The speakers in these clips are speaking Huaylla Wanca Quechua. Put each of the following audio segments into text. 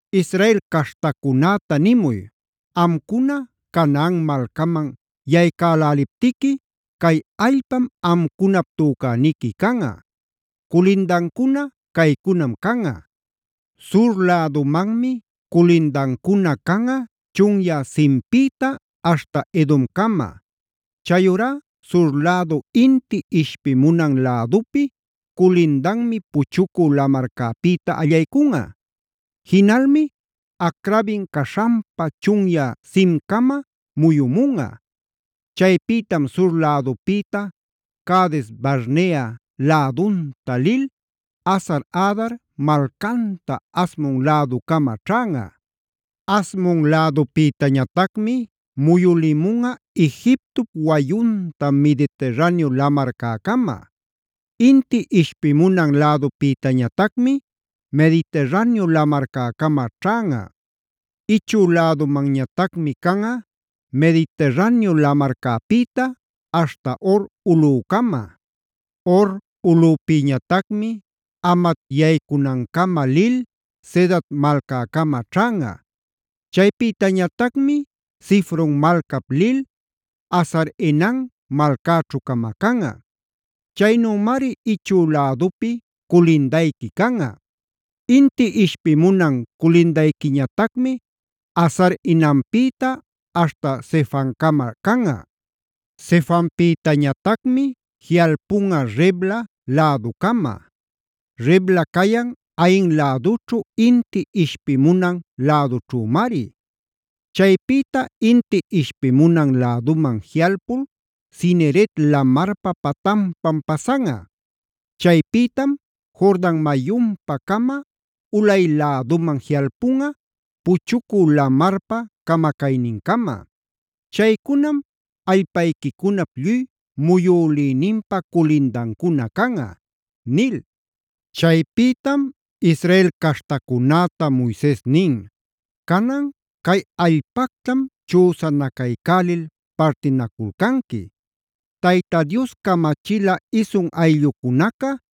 “Israel caśhtacunäta nimuy: ‘Amcuna Canaan malcaman yaycäläliptiqui cay allpam amcunap tücäniqui canꞌa. Culindancuna caycunam canꞌa: “ ‘Sur lädumanmi culindancuna canꞌa chunyä Zinpïta aśhta Edomcama. Chayurá sur lädu inti ishpimunan lädupi culindanmi Puchucü Lamarcäpïta allaycunꞌa. Jinalmi Acrabim caśhanpa chunyä Zincama muyumunꞌa. Chaypïtam sur lädupïta Cades-barnea lädunta lil Hasar-adar malcanta Asmon läducama ćhanꞌa. Asmon lädupïtañatacmi muyulimunꞌa Egiptop wayunta Mediterraneo lamarcäcama. “ ‘Inti ishpimunan lädupïtañatacmi Mediterraneo lamarcäcama ćhanꞌa. “ ‘Ichü lädumantañatacmi canꞌa: Mediterraneo lamarcäpïta aśhta Hor ulꞌücama. Hor ulꞌüpïñatacmi Hamat yaycunancama lil Zedad malcäcama ćhanꞌa. Chaypïtañatacmi Zifron malcap lil Hazar-enan malcäćhu camacanꞌa. Chaynümari ichü lädupi culindayqui canꞌa. “ ‘Inti ishpimunan culindayquiñatacmi Hazar-enanpïta aśhta Sefamcama canꞌa. Sefampïtañatacmi jiꞌalpunꞌa Ribla läducama; Ribla cayan Ain lädućhu inti ishpimunan lädućhümari. Chaypïta inti ishpimunan läduman jiꞌalpul Cineret lamarpa patanpam pasanꞌa. Chaypïtam Jordan mayunpa-cama ulay läduman jiꞌalpunꞌa Puchucü Lamarpa camacaynincama. Chaycunam allpayquicunap lluy muyülïninpa culindancuna canꞌa’” nil. Chaypïtam Israel caśhtacunäta Moises nin: “Canan cay allpactam chüsanacaycälil partinaculcanqui. Tayta Dios camachila isun ayllucunaca,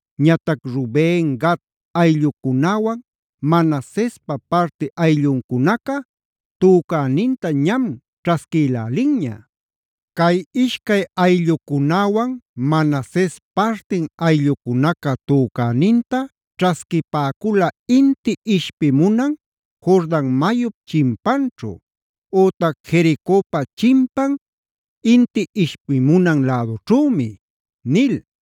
Ñatac Ruben, Gad ayllucunäwan Manasespa parti aylluncunaca tücäninta ñam ćhasquïlälinña. Cay ishcay ayllucunäwan Manases partin ayllucunaca tücäninta ćhasquipäcula inti ishpimunan Jordan mayup chimpanćhu, ütac Jericopa chimpan inti ishpimunan lädućhümi”c nil.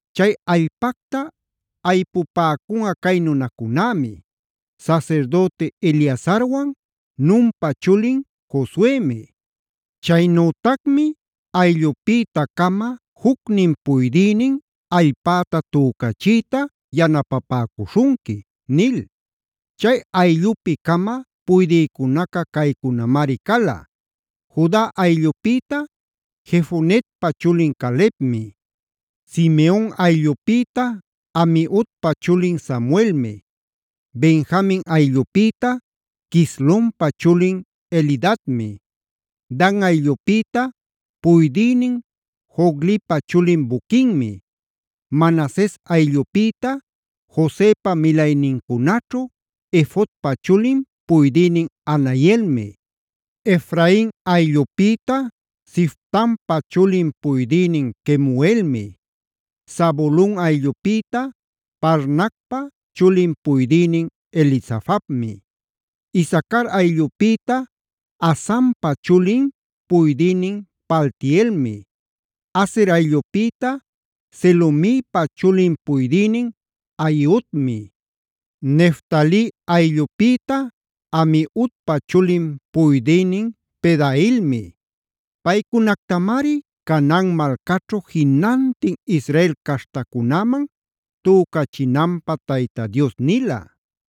“Chay allpacta aypüpäcunꞌa cay nunacunämi: Sasirdüti Eleazarwan Nunpa chulin Josuemi. Chaynütacmi ayllupïta-cama jucnin puydïnin allpäta tücachiyta yanapapäcuśhunqui” nil. Chay allupi-cama puydïcunaca caycunamari cala: Juda ayllupïta Jefonepa chulin Calebmi. Simeon ayllupïta Amiudpa chulin Samuelmi. Benjamin ayllupïta Quislonpa chulin Elidadmi. Dan ayllunpïta puydïnin Joglipa chulin Buquinmi. Manases ayllupïta Josepa milaynincunaćhu Efodpa chulin puydïnin Hanielmi. Efrain ayllupïta Siftanpa chulin puydïnin Kemuelmi. Zabulon ayllupïta Parnacpa chulin puydïnin Elisafanmi. Isacar ayllupïta Azanpa chulin puydïnin Paltielmi. Aser ayllupïta Selomipa chulin puydïnin Ahiudmi. Neftali ayllupïta Amiudpa chulin puydïnin Pedaelmi. Paycunactamari Canaan malcaćhu jinantin Israel caśhtacunäman tücachinanpä Tayta Dios nila.